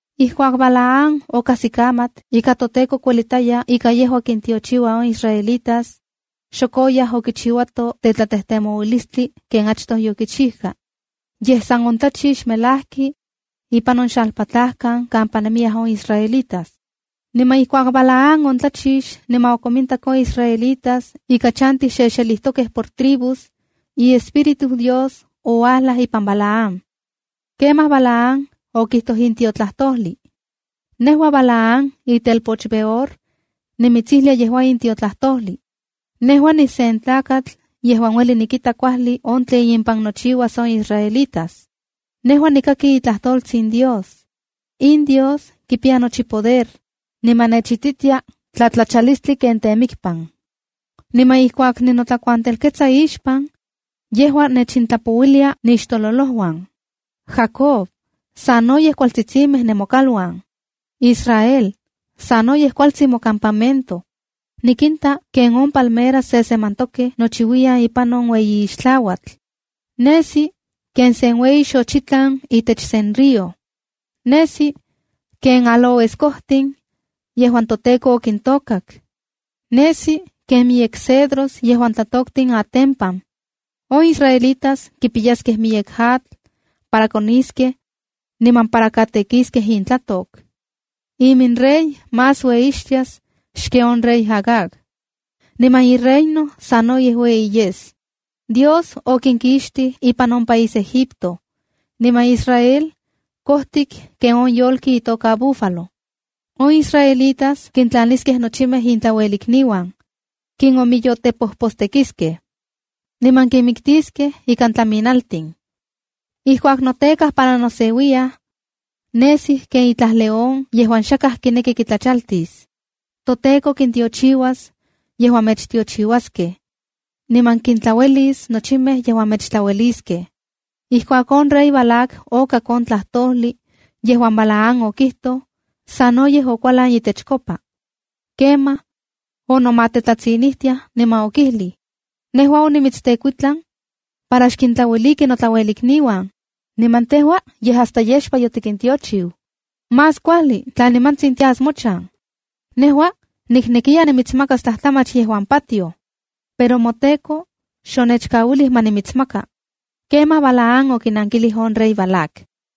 Ijkuak Balaam okajsikamat ika toTEKO kuelitaya ika yejua kintiochiua on israelitas, xok oyaj okichiuato tetlatejtemoualistli ken achtoj yokichijka. Yej, san ontlachix melajki ipan on xalpatlajkan kampa nemiyaj on israelitas. Niman ijkuak Balaam ontlachix niman okomintak on israelitas ika chantij xexelijtokej por tribus, iespíritu Dios ouajlaj ipan Balaam. Kemaj Balaam okijtoj in tiotlajtojli: “Nejua Balaam, itelpoch Beor, nimitsijlia yejua in tiotlajtojli. Nejua nisentlakatl yejuan ueli nikita kuajli on tlen impan nochiuas on israelitas. Nejua nikaki itlajtoltsin Dios. In Dios kipiya nochi poder, niman nechititia tlatlachalistli ken temikpan. Niman ijkuak ninotlakuantelketsa ixpan, yejua nechintlapouilia nixtololojuan. ¡Jacob, sanoyej kualtsitsimej nemokaluan! ¡Israel, sanoyej kualtsin mocampamento! Nikinta ken palmeras sesemantokej nochiuiyan ipan on ueyi ixtlauatl. Nesi ken sen ueyi xochitlan itech sen río. Nesi ken aloeskojtin yejuan toTEKO okintôkak. Nesi ken miyek cedros yejuan tlatoktin atempan. On israelitas kipiyaskej miyek atl, para koniskej niman para katekiskej intlatok. Iminrey más ueyixtias xken on rey Agag. Niman ireino sanoyej ueyi yes. Dios okinkixtij ipan on país Egipto. Niman Israel kojtik ken on yolki itoka búfalo. On israelitas kintlaniskej nochimej intlauelikniuan, kinomiyotepojpostekiskej, niman kinmiktiskej ika tlaminaltin. Ijkuak notekaj para noseuiyaj, nesij ken itlaj león yejuan xakaj kineki kitlachaltis. ¡ToTEKO kintiochiuas yejuan mechtiochiuaskej, niman kintlauelis nochimej yejuan mechtlaueliskej!” Ijkuak on rey Balac okak on tlajtojli yejuan Balaam okijtoj, sanoyej okualan itechkopa. Kemaj onomatetlatsinijtiaj, niman okijlij: —Nejua onimitstekuitlan para xkintlaueliki notlauelikniuan, niman tejua yej hasta yexpa yotikintiochiu. ¡Más kuajli tla nimantsin tias mochan! Nejua niknekiya nimitsmakas tlajtlamach yejuan patioj, pero moTEKO xonechkauilij ma nimitsmaka. Kemaj Balaam okinankilij on rey Balac: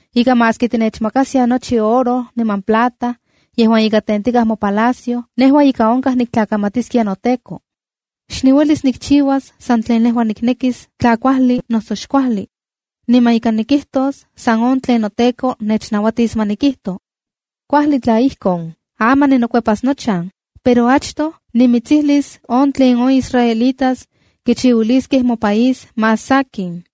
ika maski tinechmakaskia nochi oro niman plata yejuan ika tentikaj mopalacio, nejua ika onkaj niktlakamatiskia noTEKO. Xniuelis nikchiuas san tlen nejua niknekis tla kuajli noso xkuajli. Niman ika nikijtos san on tlen noTEKO nechnauatis ma nikijto. Kuajli tla ijkon, aman ninokuepas nochan, pero achtoj nimitsijlis on tlen on israelitas kichiuiliskej mopaís más sakin.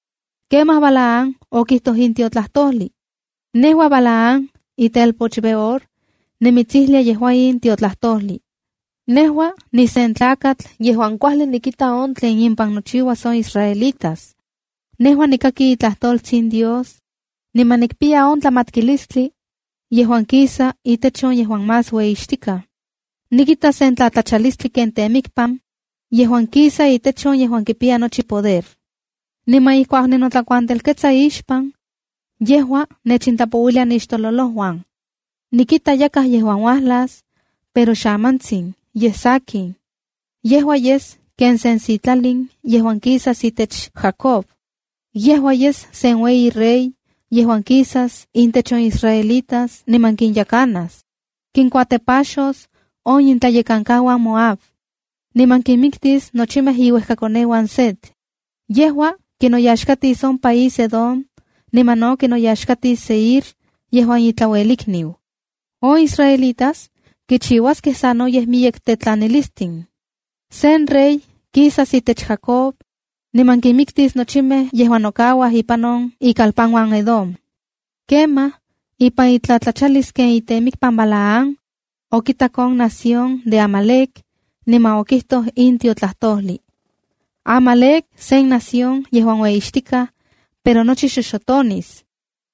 Kemaj Balaam okijtoj in tiotlajtojli: “Nejua Balaam, itelpoch Beor, nimitsijlia yejua in tiotlajtojli. Nejua nisen tlakatl yejuan kuajli nikita on tlen impan nochiuas on israelitas. Nejua nikaki itlajtoltsin Dios, niman nikpiya tlamatkilistli yejuan kisa itech on yejuan Más Ueyixtika. Nikita sen tlatlachalistli ken temikpan yejuan kisa itech on yejuan kipiya nochi poder. Niman ijkuak ninotlakuantelketsa ixpan, yejua nechintlapouilia nixtololojuan. Nikita yakaj yejuan uajlas, pero xamantsin, yej sankin. Yejua yes ken sen sitlalin yejuan kisas itech Jacob. Yejua yes sen ueyi rey yejuan kisas intech on israelitas niman kinyekanas. Kinkuatepaxos on itlayekankauan Moab, niman kinmiktis nochimej iuejkakoneuan Set. Yejua kinoyaxkatis on país Edom niman no kinoyaxkatis Seir yejuan itlauelikniu. On israelitas kichiuaskej sanoyej miyek tetlanilistin. Sen rey kisas itech Jacob, niman kinmiktis nochimej yejuan nokauaj ipan on ikalpanuan Edom.” Kemaj ipan itlatlachalis ken temikpan Balaam, okitak on nación de Amalec, niman okijtoj in tiotlajtojli: “Amalec sen nación yejuan ueyixtikaj, pero nochi xoxotonis.”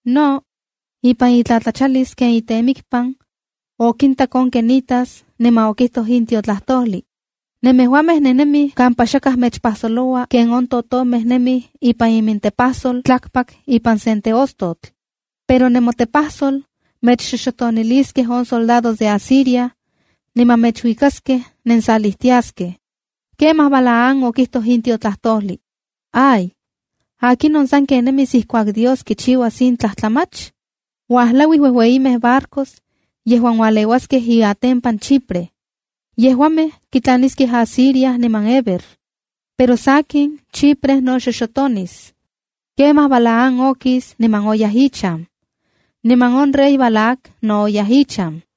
No, ipan itlatlachalis ken temikpan, okintak on quenitas, niman okijtoj in tiotlajtojli: “Nemejuamej nennemij kampa xakaj mechpajsoloua ken on totomej nemij ipan imintepajsol tlakpak ipan se teostotl. Pero nemotepajsol mechxoxotoniliskej on soldados de Asiria, niman mechuikaskej nensalijtiaskej.” Kemaj Balaam okijtoj in tiotlajtojli: “¡Ay! ¿Akinon sanken nemis ijkuak Dios kichiuas in tlajtlamach? Uajlauij uejueyimej barcos yejuan ualeuaskej iatempan Chipre. Yejuamej kitlaniskej Asiria niman Heber. Pero sakin, Chipre no xoxotonis.” Kemaj Balaam okis niman oyaj ichan. Niman on rey Balac no oyaj ichan.